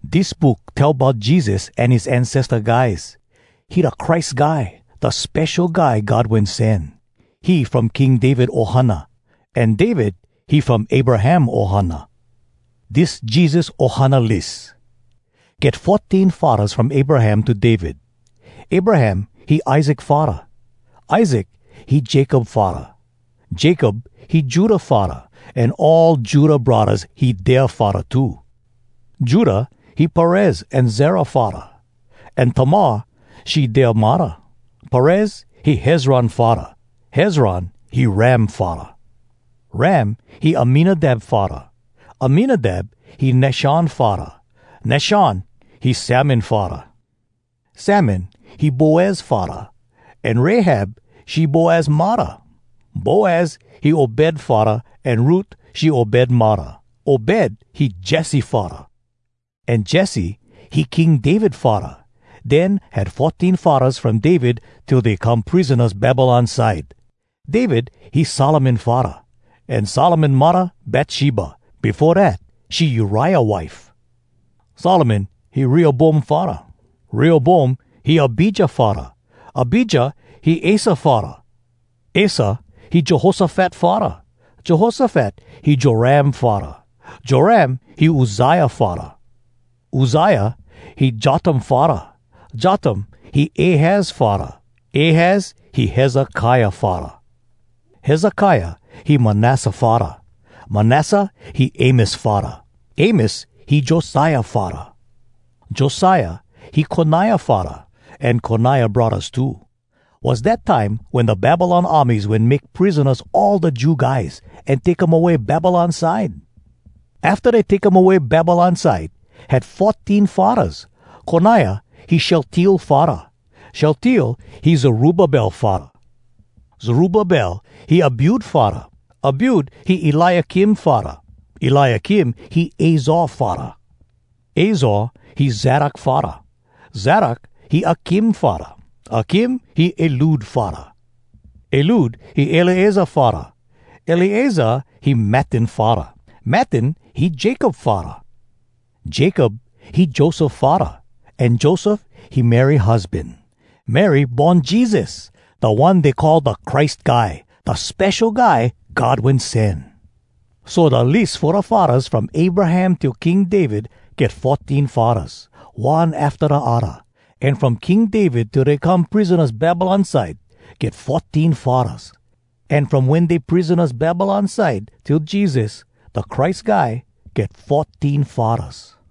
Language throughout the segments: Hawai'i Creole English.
Dis book tell bout Jesus an his ancesta guys. He da Christ Guy, da Spesho Guy God Wen Sen. He from King David ohana, an David, he from Abraham ohana. Dis Jesus ohana lis. Get fourteen faddahs from Abraham to David: Abraham, he Isaac faddah. Isaac, he Jacob faddah. Jacob, he Judah faddah, an all Judah braddahs, he dea faddah too. Judah, he Perez an Zerah faddah, an Tamar, she dea muddah. Perez, he Hezron faddah. Hezron, he Ram faddah. Ram, he Aminadab faddah. Aminadab, he Nashon faddah. Nashon, he Salmon faddah. Salmon, he Boaz faddah, an Rahab, she Boaz muddah. Boaz, he Obed faddah, an Ruth, she Obed muddah. Obed, he Jesse faddah. An Jesse, he King David faddah. Den had fourteen faddahs from David till dey come prisonas Babylon side: David, he Solomon faddah. An Solomon muddah Batsheba, befo dat she Uriah wife. Solomon, he Rehoboam faddah. Rehoboam, he Abijah faddah. Abijah, he Asa faddah. Asa, he Jehoshafat faddah. Jehoshafat, he Joram faddah. Joram, he Uzziah faddah. Uzziah, he Jotham faddah. Jotham, he Ahaz faddah. Ahaz, he Hezekiah faddah. Hezekiah, he Manasseh faddah. Manasseh, he Amos faddah. Amos, he Josiah faddah. Josiah, he Koniah faddah, an Koniah braddahs too. Was dat time wen da Babylon armies wen make prisonas all da Jew guys, an take um away Babylon side. Afta dey take um away Babylon side, had fourteen faddahs: Koniah, he Shealtiel faddah. Shealtiel, he Zerubbabel faddah. Zerubbabel, he Abiud faddah. Abiud, he Eliakim faddah. Eliakim, he Azor faddah. Azor, he Zadok faddah. Zadok, he Akim faddah. Akim, he Eliud faddah. Eliud, he Eleazar faddah. Eleazar, he Mattan faddah. Mattan, he Jacob faddah. Jacob, he Joseph faddah. An Joseph, he Mary husban. Mary born Jesus, da one dey call da Christ Guy, da Spesho Guy God Wen Sen. So, da lis fo da faddahs from Abraham till King David, get fourteen faddahs, one afta da odda, an from King David till dey come prisonas Babylon side, get fourteen faddahs, an from wen dey prisonas Babylon side till Jesus, da Christ Guy, get fourteen faddahs.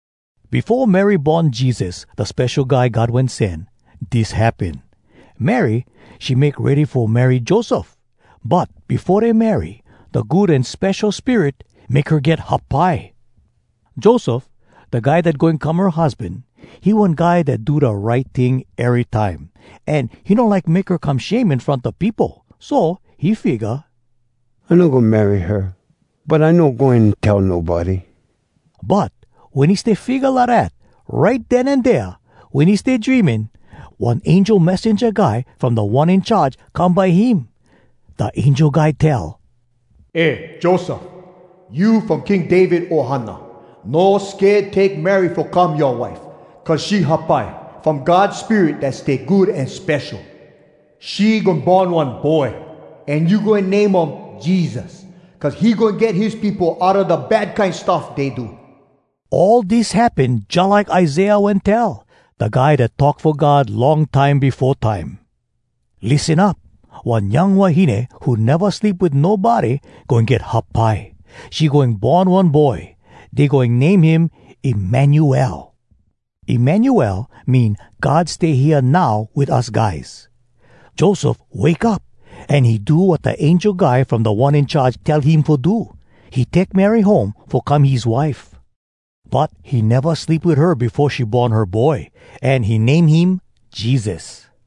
Befo Mary born Jesus, da Spesho Guy God Wen Sen, dis happen. Mary, she make ready fo marry Joseph. But befo dey marry, da Good An Spesho Spirit make her get hapai. Joseph, da guy dat goin come her husban, he one guy dat do da right ting erytime, an he no like make her come shame in front da peopo. So he figga, “I no goin marry her, but I no goin tell nobody.” But wen he stay figga lidat, right den an dea, wen he stay dreaming, one angel messenja guy from Da One In Charge come by him. Da angel guy tell, “Eh Joseph! You from King David ohana. No sked take Mary fo come yoa wife, cuz she hapai from God Spirit dat stay good an spesho. She goin born one boy, an you goin name um Jesus, cuz he goin get his peopo outa da kine bad stuff dey do.” All dis happen jalike Isaiah wen tell, da guy dat talk fo God long time befo time, “Lissen up! One young wahine Who neva sleep wit nobody, Goin get hapai. She goin born one boy. Dey goin name him Emmanuel.” (“Emmanuel” mean, “God stay hea now wit us guys.”) Joseph wake up an he do wat da angel guy from Da One In Charge tell him fo do. He take Mary home, fo come his wife. But he neva sleep wit her befo she born her boy. An he name him Jesus.